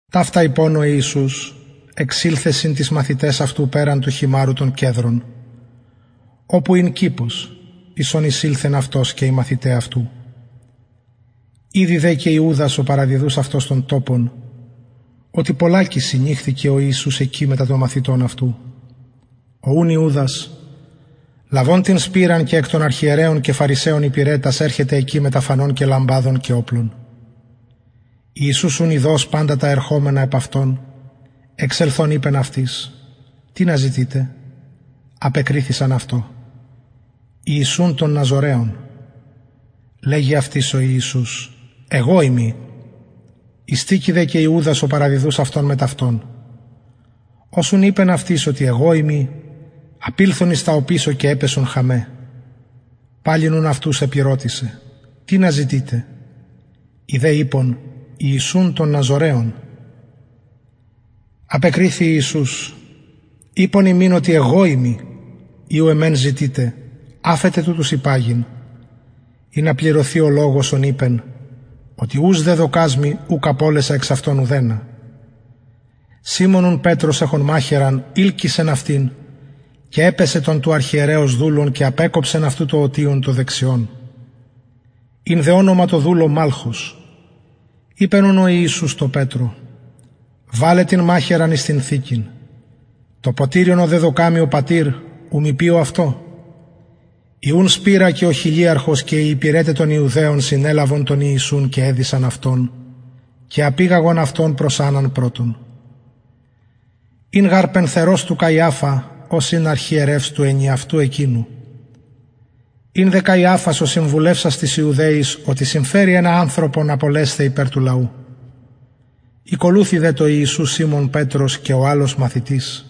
ταυτα ειπων ο ιησους εξηλθεν συν τοις μαθηταις αυτου περαν του χειμαρρου των κεδρων οπου ην κηπος εις ον εισηλθεν αυτος και οι μαθηται αυτου ηδει δε και ιουδας ο παραδιδους αυτον τον τοπον οτι πολλακις συνηχθη ο ιησους εκει μετα των μαθητων αυτου ο ουν ιουδας λαβων την σπειραν και εκ των αρχιερεων και φαρισαιων υπηρετας ερχεται εκει μετα φανων και λαμπαδων και οπλων ιησους ουν ειδως παντα τα ερχομενα επ αυτον εξελθων ειπεν αυτοις τινα ζητειτε απεκριθησαν αυτω ιησουν τον ναζωραιον λεγει αυτοις ο ιησους εγω ειμι ειστηκει δε και ιουδας ο παραδιδους αυτον μετ αυτων ως ουν ειπεν αυτοις οτι εγω ειμι απηλθον εις τα οπισω και επεσον χαμαι παλιν ουν αυτους επηρωτησεν τινα ζητειτε οι δε ειπον ιησουν τον ναζωραιον απεκριθη ιησους ειπον υμιν οτι εγω ειμι ει ουν εμε ζητειτε αφετε τουτους υπαγειν ινα πληρωθη ο λογος ον ειπεν οτι ους δεδωκας μοι ουκ απωλεσα εξ αυτων ουδενα σιμων ουν πετρος εχων μαχαιραν ειλκυσεν αυτην και επαισεν τον του αρχιερεως δουλον και απεκοψεν αυτου το ωτιον το δεξιον ην δε ονομα τω δουλω μαλχος ειπεν ουν ο ιησους τω πετρω βαλε την μαχαιραν σου εις την θηκην το ποτηριον ο δεδωκεν μοι ο πατηρ ου μη πιω αυτο η ουν σπειρα και ο χιλιαρχος και οι υπηρεται των ιουδαιων συνελαβον τον ιησουν και εδησαν αυτον και απηγαγον αυτον προς ανναν πρωτον ην γαρ πενθερος του καιαφα ος ην αρχιερευς του ενιαυτου εκεινου ην δε καιαφας ο συμβουλευσας τοις ιουδαιοις οτι συμφερει ενα ανθρωπον απολεσθαι υπερ του λαου ηκολουθει δε τω ιησου σιμων πετρος και ο αλλος μαθητης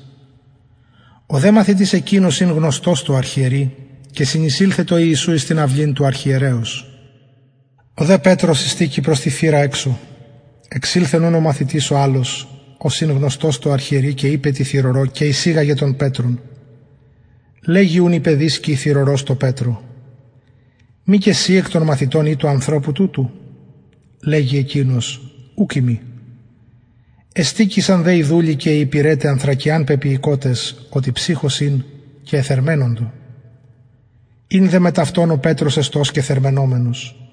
ο δε μαθητης εκεινος ην γνωστος τω αρχιερει και συνεισηλθεν τω ιησου εις την αυλην του αρχιερεως ο δε πετρος ειστηκει προς τη θυρα εξω εξηλθεν ουν ο μαθητης ο αλλος ος ην γνωστος τω αρχιερει και ειπεν τη θυρωρω και εισηγαγεν τον πετρον λεγει ουν η παιδισκη η θυρωρος τω πετρω μη και συ εκ των μαθητων ει του ανθρωπου τουτου λεγει εκεινος ουκ ειμι ειστηκεισαν δε οι δουλοι και οι υπηρεται ανθρακιαν πεποιηκοτες οτι ψυχος ην και εθερμαινοντο ην δε μετ αυτων ο πετρος εστως και θερμαινομενος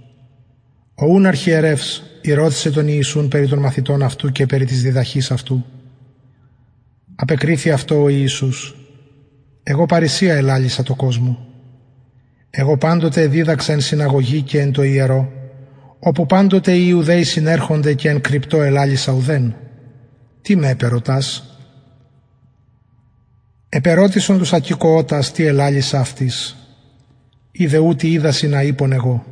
ο ουν αρχιερευς ηρωτησεν τον ιησουν περι των μαθητων αυτου και περι της διδαχης αυτου απεκριθη αυτω ο ιησους εγω παρρησια ελαλησα τω κοσμω εγω παντοτε εδιδαξα εν συναγωγη και εν τω ιερω οπου παντοτε οι ιουδαιοι συνερχονται και εν κρυπτω ελαλησα ουδεν τι με επερωτας επερωτησον τους ακηκοοτας τι ελαλησα αυτοις ιδε ουτοι οιδασιν α ειπον εγω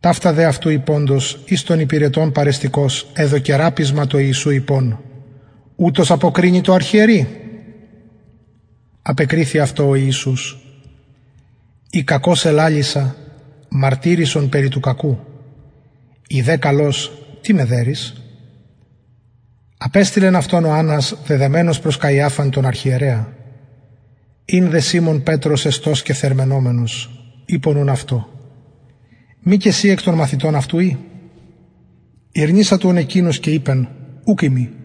ταυτα δε αυτου ειποντος εις των υπηρετων παρεστηκως εδωκεν ραπισμα τω ιησου ειπων ουτως αποκρινη τω αρχιερει απεκριθη αυτω ο ιησους ει κακως ελαλησα μαρτυρησον περι του κακου ει δε καλως τι με δερεις απεστειλεν αυτον ο αννας δεδεμενον προς καιαφαν τον αρχιερεα ην δε σιμων πετρος εστως και θερμαινομενος ειπον ουν αυτω μη και συ εκ των μαθητων αυτου ει ηρνησατο ουν εκεινος και ειπεν ουκ ειμι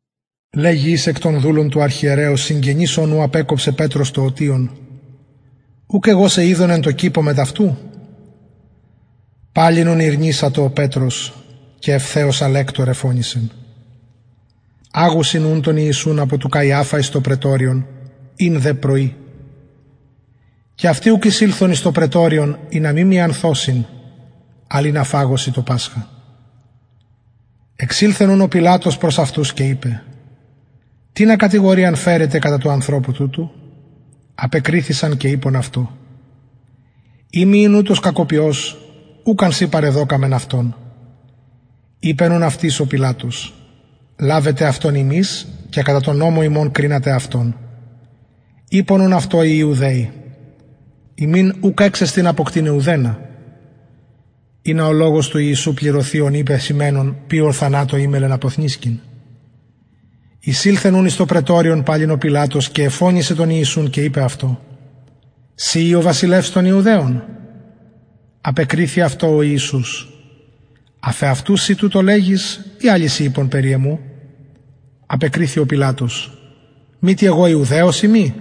λεγει εις εκ των δουλων του αρχιερεως συγγενης ων ου απεκοψεν πετρος το ωτιον ουκ εγω σε ειδον εν τω κηπω μετ αυτου παλιν ουν ηρνησατο ο πετρος και ευθεως αλεκτωρ εφωνησεν αγουσιν ουν τον ιησουν απο του καιαφα εις το πραιτωριον ην δε πρωι και αυτοι ουκ εισηλθον εις το πραιτωριον ινα μη μιανθωσιν αλλ ινα φαγωσιν το πασχα εξηλθεν ουν ο πιλατος προς αυτους και ειπεν τινα κατηγοριαν φερετε κατα του ανθρωπου τουτου απεκριθησαν και ειπον αυτω ει μη ην ουτος κακοποιος ουκ αν σοι παρεδωκαμεν αυτον ειπεν ουν αυτοις ο πιλατος λαβετε αυτον υμεις και κατα τον νομον υμων κρινατε αυτον ειπον ουν αυτω οι ιουδαιοι ημιν ουκ εξεστιν αποκτειναι ουδενα ινα ο λογος του ιησου πληρωθη ον ειπεν σημαινων ποιω θανατω ημελλεν αποθνησκειν εισηλθεν ουν εις το πραιτωριον παλιν ο πιλατος και εφωνησεν τον ιησουν και ειπεν αυτω συ ει ο βασιλευς των ιουδαιων απεκριθη αυτω ο ιησους αφ εαυτου συ τουτο λεγεις η αλλοι σοι ειπον περι εμου απεκριθη ο πιλατος μητι εγω ιουδαιος ειμι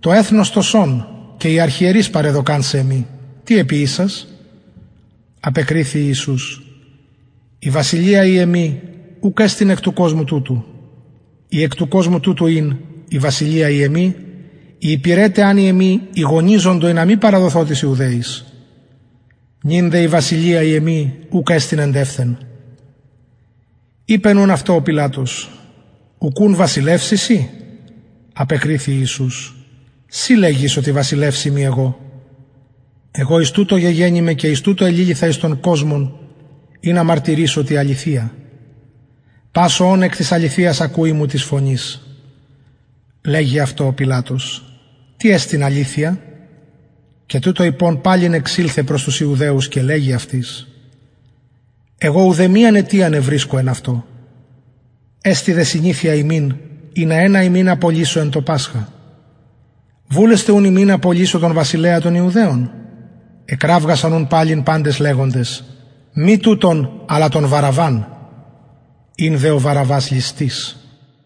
το εθνος το σον και οι αρχιερεις παρεδωκαν σε εμοι τι εποιησας απεκριθη ιησους η βασιλεια η εμη ουκ εστιν εκ του κοσμου τουτου ει εκ του κοσμου τουτου ην η βασιλεια η εμη οι υπηρεται αν οι εμοι ηγωνιζοντο ινα μη παραδοθω τοις ιουδαιοις νυν δε η βασιλεια η εμη ουκ εστιν εντευθεν ειπεν ουν αυτω ο πιλατος ουκουν βασιλευς ει συ απεκριθη ιησους συ λεγεις οτι βασιλευς ειμι εγω εγω εις τουτο γεγεννημαι και εις τουτο εληλυθα εις τον κοσμον ινα μαρτυρησω τη αληθεια πας ο ων εκ της αληθειας ακουει μου της φωνης λεγει αυτω ο πιλατος τι εστιν αληθεια και τουτο ειπων παλιν εξηλθεν προς τους ιουδαιους και λεγει αυτοις εγω ουδεμιαν αιτιαν ευρισκω εν αυτω εστιν δε συνηθεια υμιν ινα ενα υμιν απολυσω εν τω πασχα βουλεσθε ουν υμιν απολυσω τον βασιλεα των ιουδαιων εκραυγασαν ουν παλιν παντες λεγοντες μη τουτον αλλα τον βαραββαν ην δε ο βαραββας ληστης